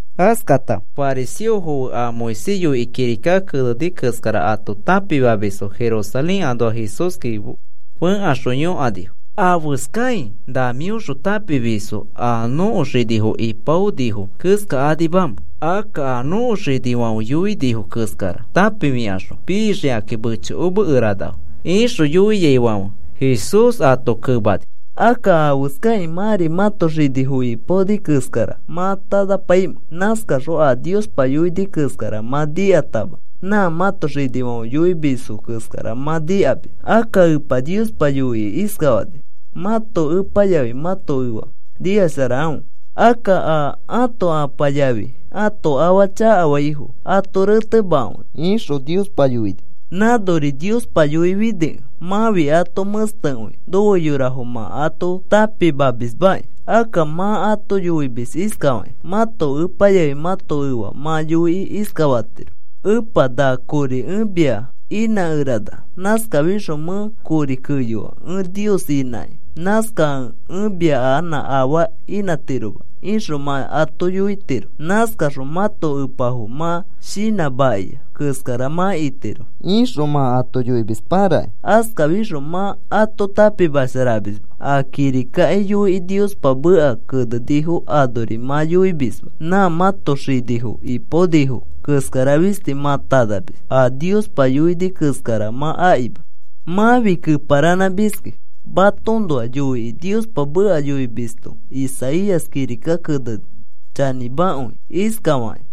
Askata fariseofo fe a Moisés yoikĩ kirika keneni keskara ato tãpimamisfo Jerusalén anoax Jesúski fẽkaxõ yõkanifo: “¿Afeskai na mĩõxõ tãpimisfo a nõko xinifo ipaonifo keskakanimamẽ? Akka a nõko xinifãfe yoinifo keskara tãpifikaxõ pixikakĩ mechokomekeranafo,” ixõ yoiaifãfe Jesús ato kemani: “Akka, ¿afeskakĩ mãri mãto xinifo ipaonifo keskara mã tanapaimẽ? Nãskaxõ a Niospa yoini keskara mã nikatama nã mãto xinifãfe yoimisfo keskara mã nikamis. Akka Epa Niospa yoikĩ iskafani: ‘Mãto epa yafi mãto efa nikasharakãfe. Akka a ãto apa yafi ãto afa chakafaifo ato retemakãfe,’ ixõ Niospa yoini. Nãnori Niospa yoifinikẽ mãfi ato mẽstekõi nofe yorafo mã ato tãpimamismaki. Akka mã ato yoimis iskafakĩ: ‘Mãto epa yafi mãto efa mã yoikĩ iskafatiro: “Epa, na kori ẽ mia inãkerana. Nãskafixõ mẽ kori keyoa ẽ Nios inãkĩ. Nãskakẽ ẽ mia anã afaa inãtiroma,” ixõ mã ato yoitiro. Nãskaxõ mãto epafo mã shinãmakĩa keskara mã itiro,’ ixõ mã ato yoimis parakĩ. Askafixõ mã ato tãpimasharamisma. A kirikaki yoikĩ Niospa meka kenenifo anori mã yoimisma. Nã mãto xinifo ipaonifo keskara fisti mã tanamis. A Niospa yoini keskara mã akima. Mãfi keparanãmiski. Matoõnoa yoikĩ Niospa meka yoimisto Isaías kirika keneni chanĩmakõi iskafakĩ: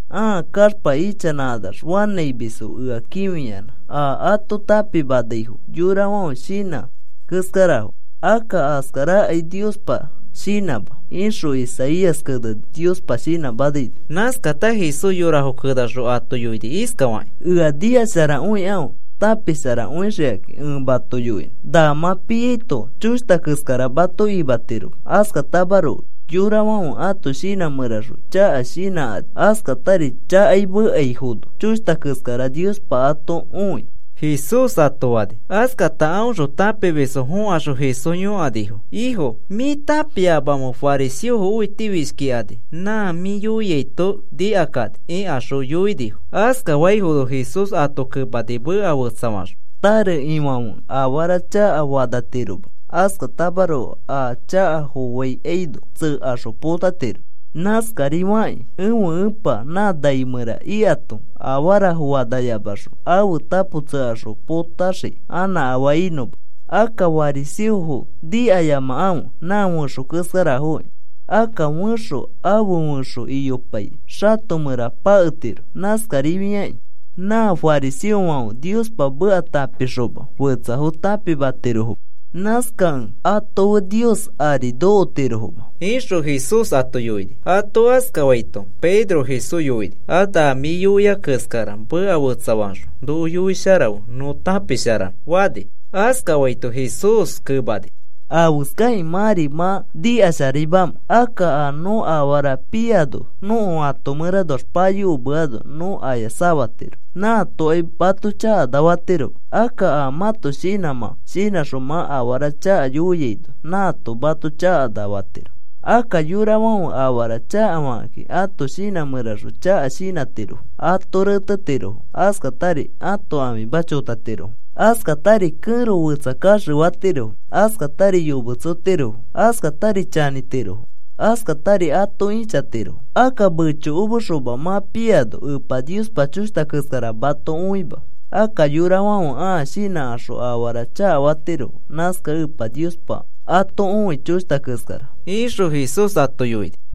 Ãa kaxpa ichanãkanax fanãimisfo ea kĩfiyanã. A ato tãpimanaifo yorafãfe shinã keskarafo. Akka askarakai Niospa shinãma, ixõ Isaías keneni, Niospa shinãmanaino.” Nãskata Jesús yorafo kenaxõ ato yoini iskafakĩ: “Ea nikasharakõikãfe tãpisharakõixikakĩ ẽ mato yoinõ. Na mã piaito choshta keskara mato imatiroma. Askatamaroko yorafãfe ãto shinã mẽraxõ chaka shinãkani, askatari chakai mekaifono choshta keskara Niospa ato õi,” Jesús ato fani. Askata aõxõ tãpimisfo fõkaxõ Jesús yõkanifo: “Ifo, ¿mĩ tãpiamamẽ fariseofo õitifishkikani nã mĩ yoiaito nikakani?” ikaxõ yoinifo. Askafaifono Jesús ato kemani meka fetsafaxõ: “Tare ifãfe afara chakafo fanatiroma. Askatamaroko a chaka foaikaino tsekaxõ potatiro. Nãskarifakĩ ẽfe Epa nã nai mẽra ikato afarafo fanayamaxõ, ãfe tapo tsekaxõ potaxii anã afaa inõma. Akka fariseofo nikayamakãfe. Nã fẽxo keskarafoki. Akka fẽxo afe fẽxo iyopai xato mẽra paketiro. Nãskarifiakĩ nã fariseofãfe Niospa meka tãpikaxoma fetsafo tãpimatirofoma. Nãskakẽ ato fe Nios ari nokotirofoma,” ixõ Jesús ato yoini. Ato askafaito Pedro Jesús yoini: “A na mĩ yoia keskara meka fetsafaxõ noko yoisharafe nõ tãpisharanõ,” fani. Askafaito Jesús kemani: “¿Afeskakĩ mãri mã nikasharaimamẽ? Akka nõ afara piano nõko ato mẽranoax payokomeano nõ aya safatiro. Nãatokai mato chakana fatiroma. Akka a mãto shinãmã shinãxõ mã afara chaka yoiaino nãato mato chakana fatiro. Akka yorafãfe afara chakafakakĩ ãto shinã mẽraxõ chaka shinãtirofo, ato retetirofo, askatari ãto ãfima chotatirofo, askatari kẽro fetsa kaxefatirofo, askatari yometsotirofo, askatari chanĩtirofo, askatari ato ĩchatirofo. Akka mechokomexoma mã piaino Epa Niospa choshta keskara mato õima. Akka yorafãfe ãa shinãkaxõ afara chakafatirofo. Nãskakẽ Epa Niospa ato õi choshta keskara,” ixõ Jesús ato yoini.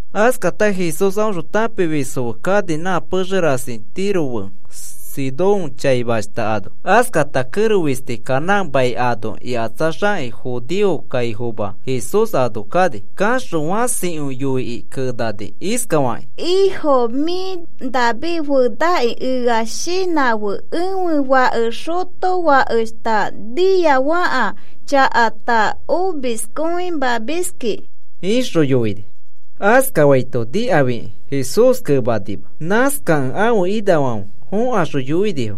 Askata Jesús aõxõ tãpimisfo fe kani nã pexe rasi Tiro fe Sidón chaimashta ano. Askata kẽro fisti Canaán mai ano ikatsaxakĩ judeo kaifoma Jesús ano kani. Kaxõ fãsikõi yoikĩ kenani iskafakĩ: “Ifo, mĩ David fenaki, ea shinãfe. Ẽfe fake xotofakeshta niafaka chakata omiskõimamiski,” ixõ yoini. Askafaito nikafikĩ Jesús kemanima. Nãskakẽ ãfe inafãfe fõkaxõ yoinifo: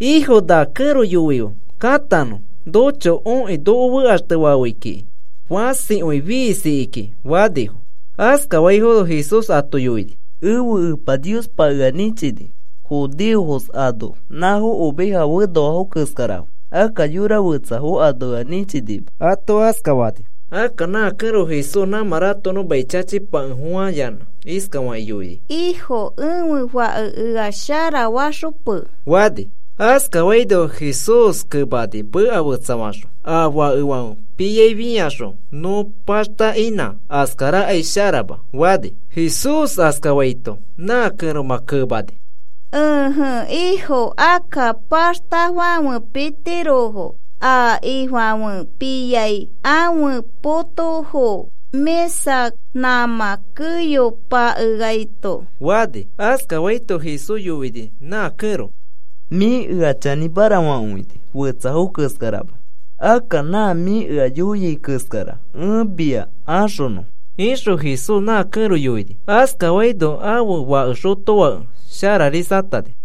“Ifo, na kẽro yoife katanõ. Nocho okĩ noko fekaxtefafei kiki. Fãsikõi fiisiki kiki,” fanifo. Askafaifono Jesús ato yoini: “Ẽfe Epa Niospa ea nĩchini judeofos ano, nãfo oveja fenoa keskarafo. Akka yora fetsafo ano ea nĩchinima,” ato askafani. Akka nã kẽro Jesús nãmã ratokonõ mai chachipakefofãyanã iskafakĩ yoini: “Ifo, ẽfe fake ea sharafaxope,” fani. Askafaino Jesús kemani meka fetsafaxõ: “A fakefãfe piai fĩaxõ nõ paxta inã, askarakai sharama,” fani. Jesús askafaito nã kẽromã kemani: “Ẽje, Ifo. Akka paxtafãfe pitirofo a ifãfe piai ãfe potofo mĩsa nãmã keyo pakeaito,” fani. Askafaito Jesús yoini nã kẽro: “Mĩ ea chanĩmara fakõini fetsafo keskarama. Akka nã mĩ ea yoiai keskara ẽ mia axonõ,” ixõ Jesús nã kẽro yoini. Askafaino ãfe fake xotofake shararisatani.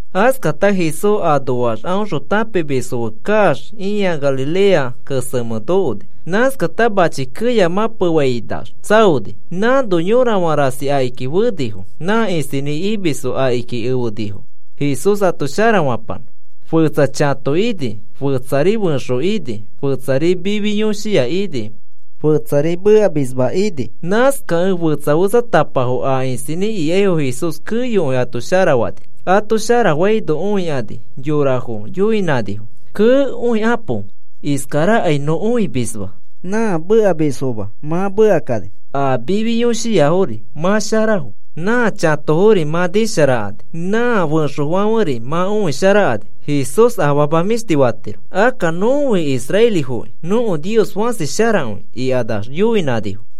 Askata Jesús anoax aõxõ tãpimisfo fe kaax ĩa Galilea kesemẽ nokoni. Nãskata machi keya mãpefainax tsaoni. Nãno yorafã rasi akiki fenifo. Nã isinĩ imisfo akiki efenifo Jesús ato sharafanõ. Fetsa chãto ini, fetsari fẽxo ini, fetsari mifi yõshia ini, fetsari mekamisma ini. Nãskakẽ fetsa fetsatapafo a isinĩ ikaifo Jesús keyokõi ato sharafani. Ato sharafaino õikani yorafo yoinãnifo: “¡Kee! Õikapo. Iskarakai nõ õimisma. Nã mekamisfoma mã mekakani. A mifi yõshiafori mã sharafo. Nã chatofori mã nisharakani. Nã fẽxofãferi mã õisharakani. Jesús afama mĩshti fatiro. Akka nõfi israelifokĩ nõko Nios fãsi sharakõi,” ikanax yoinãnifo.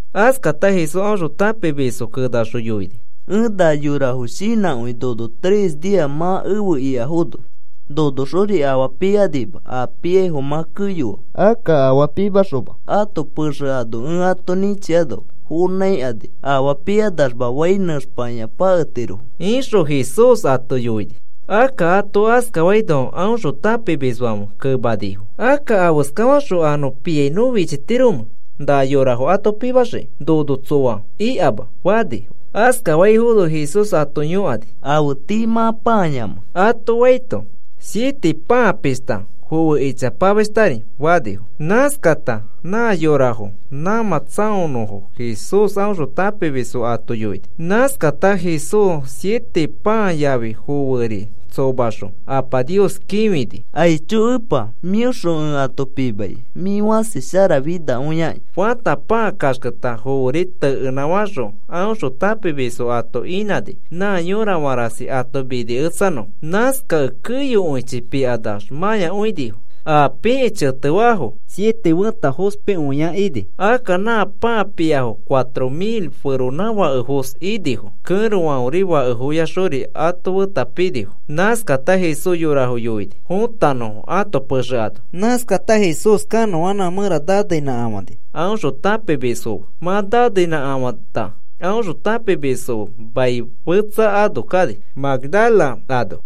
Askata Jesús aõxõ tãpimisfo kenaxõ yoini: “Ẽ na yorafo shinãkõi, nono tres nia mã efe ikafono, nonoxori afaa pikanima. A piaifo mã keyoa. Akka afaa pimaxoma ãto pexe ano ẽ ato nĩchiano fonãikani afaa pikanaxma fai nẽxpakĩa paketirofo,” ixõ Jesús ato yoini. Akka ato askafaino aõxõ tãpimisfãfe kemanifo: “Akka, ¿afeskaxõ a nõ piai nõ fichitiromẽ na yorafo ato pimaxikĩ nono tsoa ikama?” fanifo. Askafaifono Jesús ato yõkani: “¿Afe tii mã pãayamẽ?” ato faito, “Siete pãa pishta, foe ichapamashtari,” fanifo. Nãskata nã yorafo nãmã tsaonõfo Jesús aõxõ tãpimisfo ato yoini. Nãskata Jesús siete pãa yafi foeri tsomaxõ Apa Nios kĩfini: “Aicho Epa, mĩõxõ ẽ ato pimaikai. Mĩ fãsi sharafinakõiaki,” fata, pãa kaxketa, foeri tekenãfaxõ aõxõ tãpimisfo ato inãni nã yorafã rasi ato miniketsanõfo. Nãskakẽ keyokõichi pikanax mãyakõinifo. A pikĩ chetefaafo siete fẽta fospikõia ini. Akka nã pãa piafo cuatro mil feronãfakefos inifo. Kẽrofãferi fakefoyaxori ato feta pinifo. Nãskata Jesús yorafo yoini fõtanõfo ãto pexe ano. Nãskata Jesús kanõanãfã mẽra naneinãkafani aõxõ tãpimisfo fe. Mã naneinãkafãta aõxõ tãpimisfo fe mai fetsa ano kani, Magdala ano.